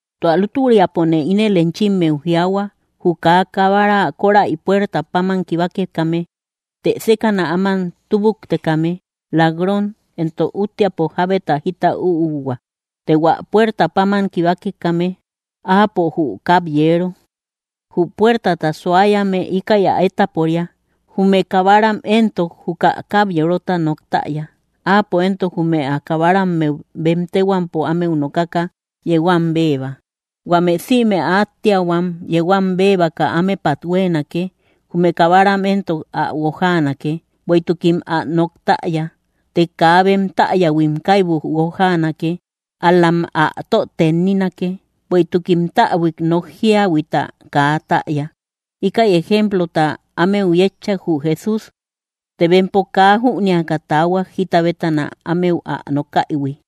’Tua lútüriapone ínel enchimmeu jiaahua: jü kaa kabara kóräi puerta páman kibakekame, të sékäna áman túbuktekame, lak‑ron, éntok útteapo jábeta jita üuhua. Të hua puerta páman kibakekame, áapo jü kab‑yeero. Jü puertata suayame, íkäi ä étaporia. Jume kabaram éntok juka kab‑yeerota nok täya. Áapo éntok jume ä kabarammeu bem téhuampo ámeu nokaka, yeu am béeba. Huame sïme ä átteahuam yeu am bebaka ámepat huéenake. Jume kabaram éntok ä guojaanake, bueïtukim ä nok täya. Të kaa bem täyähuim kaibu guojaanake, ál‑lam ä tö tenninake, bueïtukim täbuik nok jíahuita kaa täya. Íkäi ejemplota ámeu yétchak, jü Jesús; të bempo kaa jünéaka taahuak, jita bétana ámeu ä nokaïhui.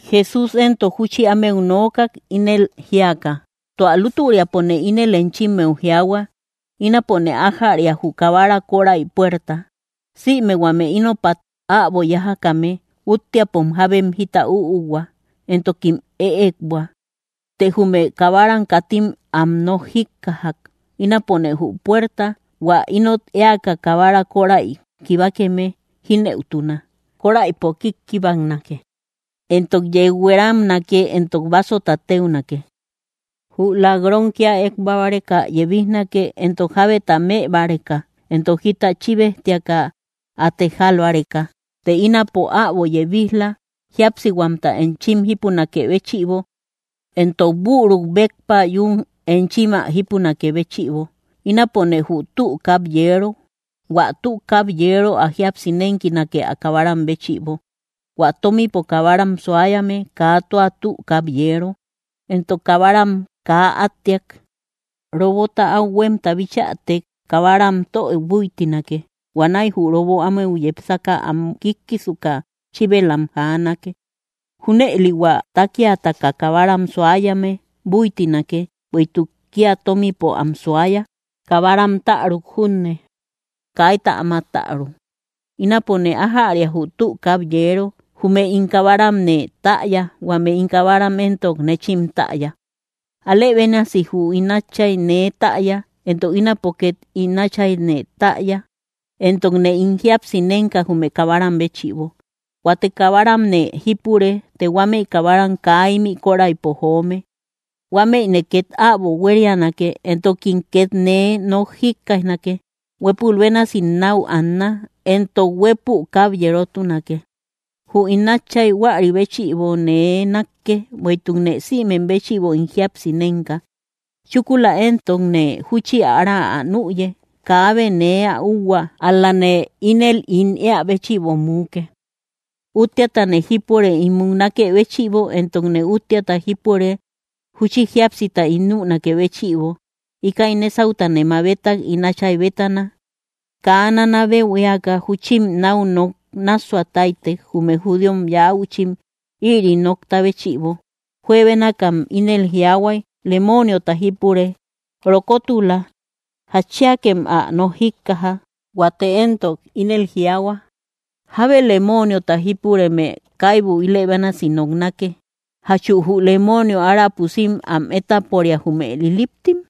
Jesús éntok júchi ámeu nookak, ínel jíaka: —Tua lútüriapone ínel enchimmeu jiaahua: Ínapone ájäria jü kabara kóräi puerta. Sïme huame ínopat äbo yájakame, útteapom jábem jita üuhua, éntokim ëekbua; të jume kabaram katim am nok jíkkajak. Ínapone jü puerta; hua ínot éaka kabara kóräiu kibakeme, jínëutuna. Kóräipo kíkkibaknake, éntok yeu hueramnake, éntok básota téunake. ’Jü lak‑ron kía ékbua báreka yebijnake, éntok jábeta mëbáreka éntok jita chíbejtiaka ä tejal báreka. Të ínapo äbo yebij‑la jíapsihuamta enchim jípunakë béchïbo, éntok büruk béppa yún enchim ä jípunakë béchïbo. Ínapone jü tü kab‑yeero. Huä tü kab‑yeero ä jíapsi nénkinake ä kabaram béchïbo. Huä tómipo kabaram suayame, kaa tua tü kab‑yeero, éntok kabaram kaa átteak. Robota áu huémta bichätek, kabaram tö búitinake. Huanäi jü robo ámeu yepsaka am kíkkisuka chíbelam am jaanake. Júnëli hua tákiataka kabaram suayame búitinake, bueïtuk kía tómipo am suaya. Kabaram täruk junne, kaita áma täru. ’Ínapone ájäria jü tü kab‑yeero. Jume ín kabaramne täya; huame ín kabaram éntok, nechim täya. Alë bénasi jü ín Áchay nee täya, éntok ínapo két ín Áchayne täya. Éntokne ín jíapsi nénka jume kabaram béchïbo. Huate kabaramne jípure, të huámëi kabaram kaa ímï kóräipo joome. Huámëine két äbo huérianake, éntokim két nee nok jíkkaijnake. Huépul bénasim náu anna; éntok huépü kab‑yerotunake. ’Jü ín Áchay huäri béchïbo nee nákkë, bueïtukne sïmem béchïbo ín jíapsi nénka; chúkula éntokne júchi ára ä nüye. Kaabe nee ä úhua; ál‑lane ínel ín éä béchïbo muuke. Útteatane jípure ín múknakë béchïbo, éntokne útteata jípure júchi jíapsita ín nünakë béchïbo. Íkäi nésautane mabetak, ín Áchay bétana. Kaa nanabeu éaka, júchim náu nok nássua táytek, jume judío yäuchim, ïri nokta béchïbo. Juebénakam ínel jiaahuay: —Lemooniota jípure. Rokotula. ¿Jatchiakem ä nok jíkkaja? Huate éntok ínel jiaahua: —Jábe lemooniota jípureme kaibu ilë bénasi noknake. ¿Jachu jü lemoonio ára pusim am étaporia, jume liliptim?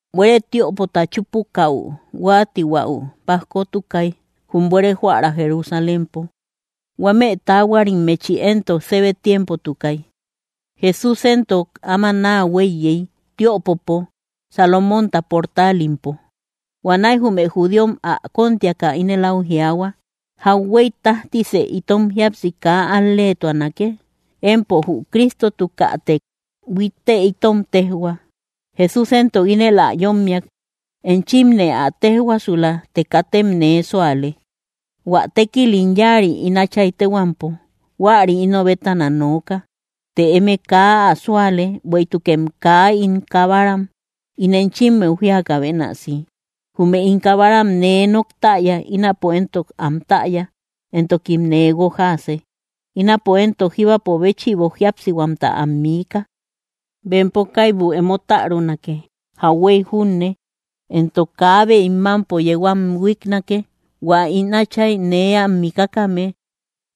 Buere tiöpota chúpukäu huáatihuau pajkotukay, jum buere joära Jerusalémpo. Huamëi taahuarimmechi éntok sébe tiempotukay. Jesús éntok áma naa huéiyey, tiöpopo, Salomónta portaalimpo. Huanäi jume judíom ä kóntiaka ínel áu jiaahua: —¿Jauhuey tájtisë itom jíapsi kaa al‑leetuanake? Empo jü Cristotukätek huittë itom téjhua. Jesús éntok ínel am yómmiak: —Enchimne ä téjhuaasula, të katem nee súale. Huä tékil ín yáari ín Áchay téhuampo, huäri ino bétana nooka; të eme kaa ä súale, bueïtukem kaa ín kabaram, ín enchimmeu jíakä bénasi. Jume ín kabaram nee nok täya; ínapo éntok am täya, éntokim nee guojaase. Ínapo éntok jíbapo béchïbo jíapsihuamta am miika. Bempo kaibu emo tärunake jauhuey junne, éntok kaabe ín mámpo yeu am huíknake. Huä ín Átchay nee am mikakame,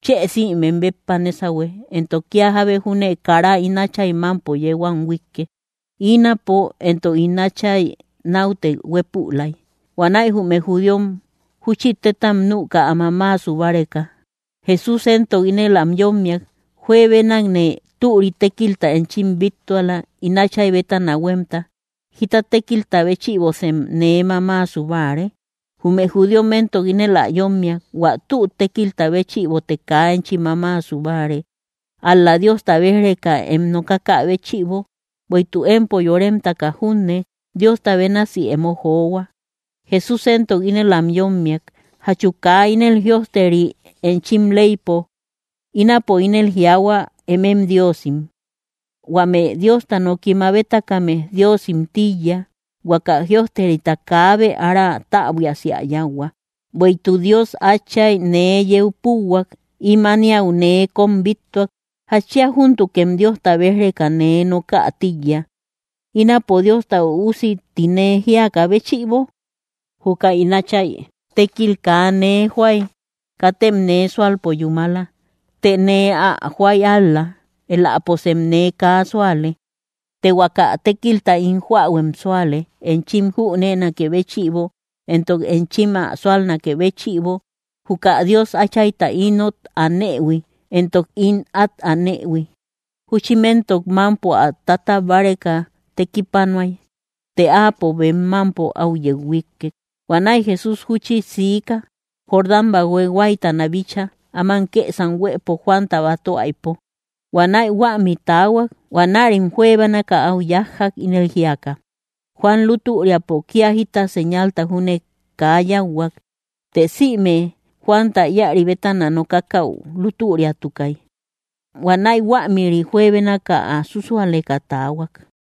chë sïmem béppa nésahue, éntok kía jábe júne kara ín Áchay mámpo yeu am huíkke. Ínapo, éntok ín Átchay, náute huépülay. Huanäi jume judíom júchi tétam nüka, ä mamaasu báreka. Jesús éntok ínel am yómmiak: —Juebenakne türi tékilta enchim bíttuala, ín Áchay bétana huémta. ¿Jíta tékilta béchïbosem nee mamaasu báare? Jume judíom éntok ínel ä yómmiak: —Huä tü tékilta béchïbote kaa enchi mamaasu báare, ál‑la Diosta béj‑reka em nokakä béchïbo; bueïtuk empo yóremtaka junne, Diosta bénasi emo johua. Jesús éntok ínel am yómmiak: —¿Jachu kaa ínel jïojteri enchim leypo: “Ínapo ínel jiaahua, emem diosim”? Huame Diosta noki mabetakame diosim tíiya. Huaka jïojterita kaabe ára täbuiasi ä yáuhua. Bueïtuk Dios Átchay nee yeu púuhuak; ím ániau nee kóm bíttuak. ¿Jatchia júntukem Diosta béj‑reka nee nokä tíiya, ínapo Diosta Üusi ti nee jíakä béchïbo? Juka ín Áchay tékil kaa nee joay, katem nee súalpo yúmala. Të nee ä joay ál‑la, éläposem nee kaa súale, të huaka tékilta ín joähuem súale, enchim jüneenakë béchïbo, éntok enchim ä súalnakë béchïbo, juka Dios Áchayta ínot anëhui, éntok ín át anëhui. Júchim éntok mámpo ä tatab báreka tekipanuay, të áapo bem mámpo áu yeu huíkkek. Huanäi Jesús júchi siika, Jordán bathue huáytana bícha, áman kësam huëpo Juanta batöaïpo. Huanäi huämi taahuak. Huanärim juebénaka áu yájjak, ínel jíaka: —Juan lútüriapo kía jita señalta júne kaa yáuhuak; të sïme Juanta íäri bétana nokakäu lútüriatukay. Huanäi huämïri juebénaka ä súsualeka taahuak.